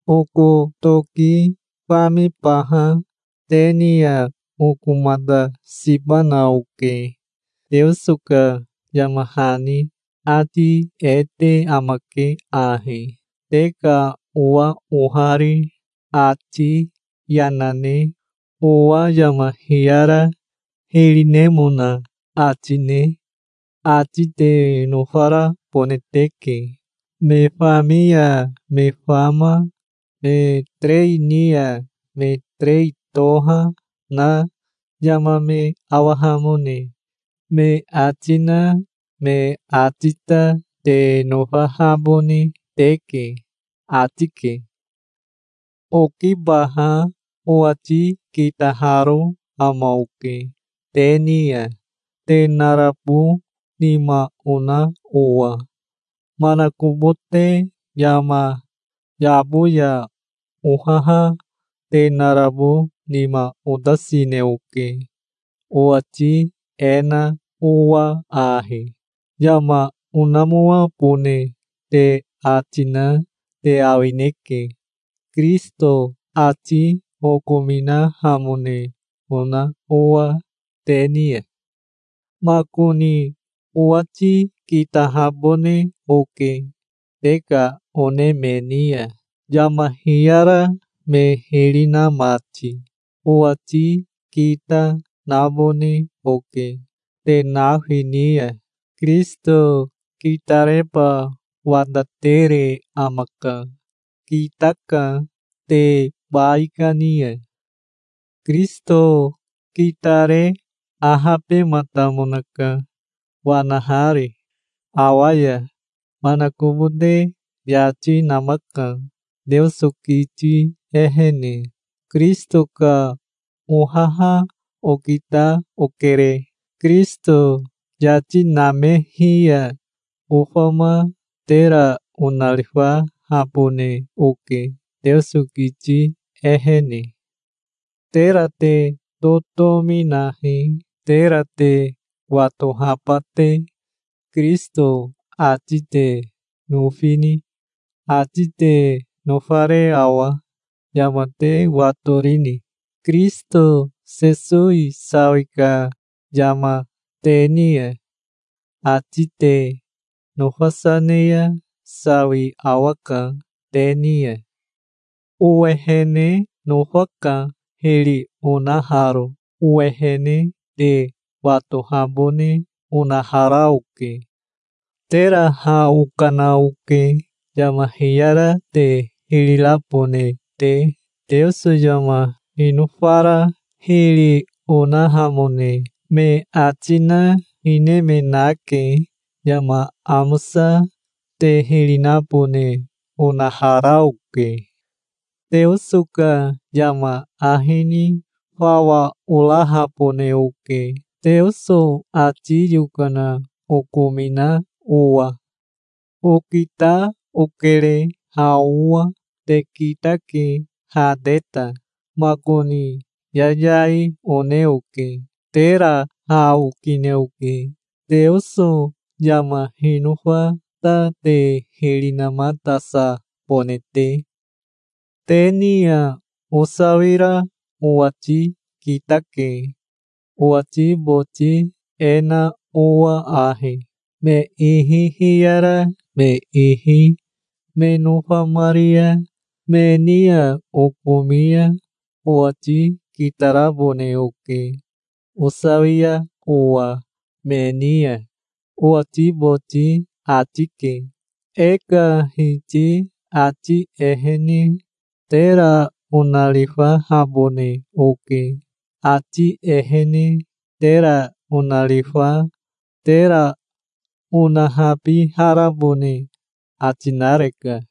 Oko toki famibaha te ni ya okomatasibana oke. Teoso ka yama hani ati e te amake ahi: "Te ka owa ohari ati yana ne owa yama hiyara hiri nemona ati ne ati te nofarabone teke. Me fami ya me fama me terei ni ya me terei, toha na yama me awahamone me ati na me ati ta te nofahabone teke", ati ke. Okibaha owati kitaharo ama oke te ni ya, te narabo nima ona owa. Manakobote yama yabo ya ohaha te narabo nima otasine oke, owati e na owa ahi: Yama onamoabone te ati na te awineke, Kirisito ati okominahamone ona owa te ni ya. Makoni owati kitahabone oke te ka one me ni ya, yama hiyara me hiri na mati. Owati kita nabone oke te nafi ni ya. Kirisito kitareba watatere amaka. Kitaka te baikani ya. Kirisito kitare ahabematamonaka, wanahari awa ya. Manakobote yati namaka Teoso kiti ehene. Kirisito ka ohaha okita okere. Kirisito yati namehi ya ofama tera onarifahabone oke, Teoso kiti ehene. Tera te totomi nahi, tera te watohaba te. Kirisito ati te nofini? Ati te nofare awa? Yama te watorini, Kirisito Sesowi sawi ka yama te ni ya? Ati te nofasa ne ya sawi awaka te ni ya. Owehene nofaka, hiri onaharo. Owehene te watohabone onahara oke. Tera ha okana oke, yama hiyara te hiri rabone te. Teoso yama hinofara hiri onahamone me ati na hine me nake. Yama amosa te hiri nabone onahara oke. Teoso ka yama ahi ni fawa orahabone oke, Teoso ati yokana okomina owa. Okita okere ha owa. Te kitake ha te ta. Makoni yayai one oke. Tera ha okine oke, Teoso yama hinofa ta te hiri namatasabone te. Te ni ya osawira owati kitake, owati boti e na owa ahi: "Me ihi hiyara me ihi me nofamari ya me ni ya okomi ya owati kitarabone oke osawia owa me ni ya", owati boti ati ke. E ka Hiti ati ehene tera onarifahabone oke. Ati ehene tera onarifa tera onahabiharabone ati nareka.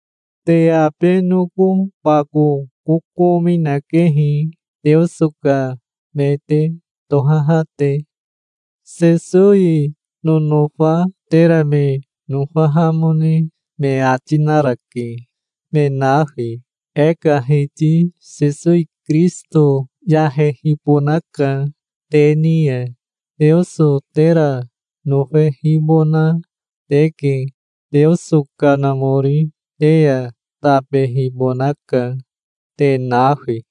Te abe noko bako kokomi nakehi, Teoso ka me te tohaha te. Sesowi nonofa tera me nofahamone me ati narake, me nafi. E ka Hiti Sesowi Kirisito yahehibonaka te ni ya. Teoso tera nofehibona teke. Teoso Kanamori te ya tabehibonaka, te nafi.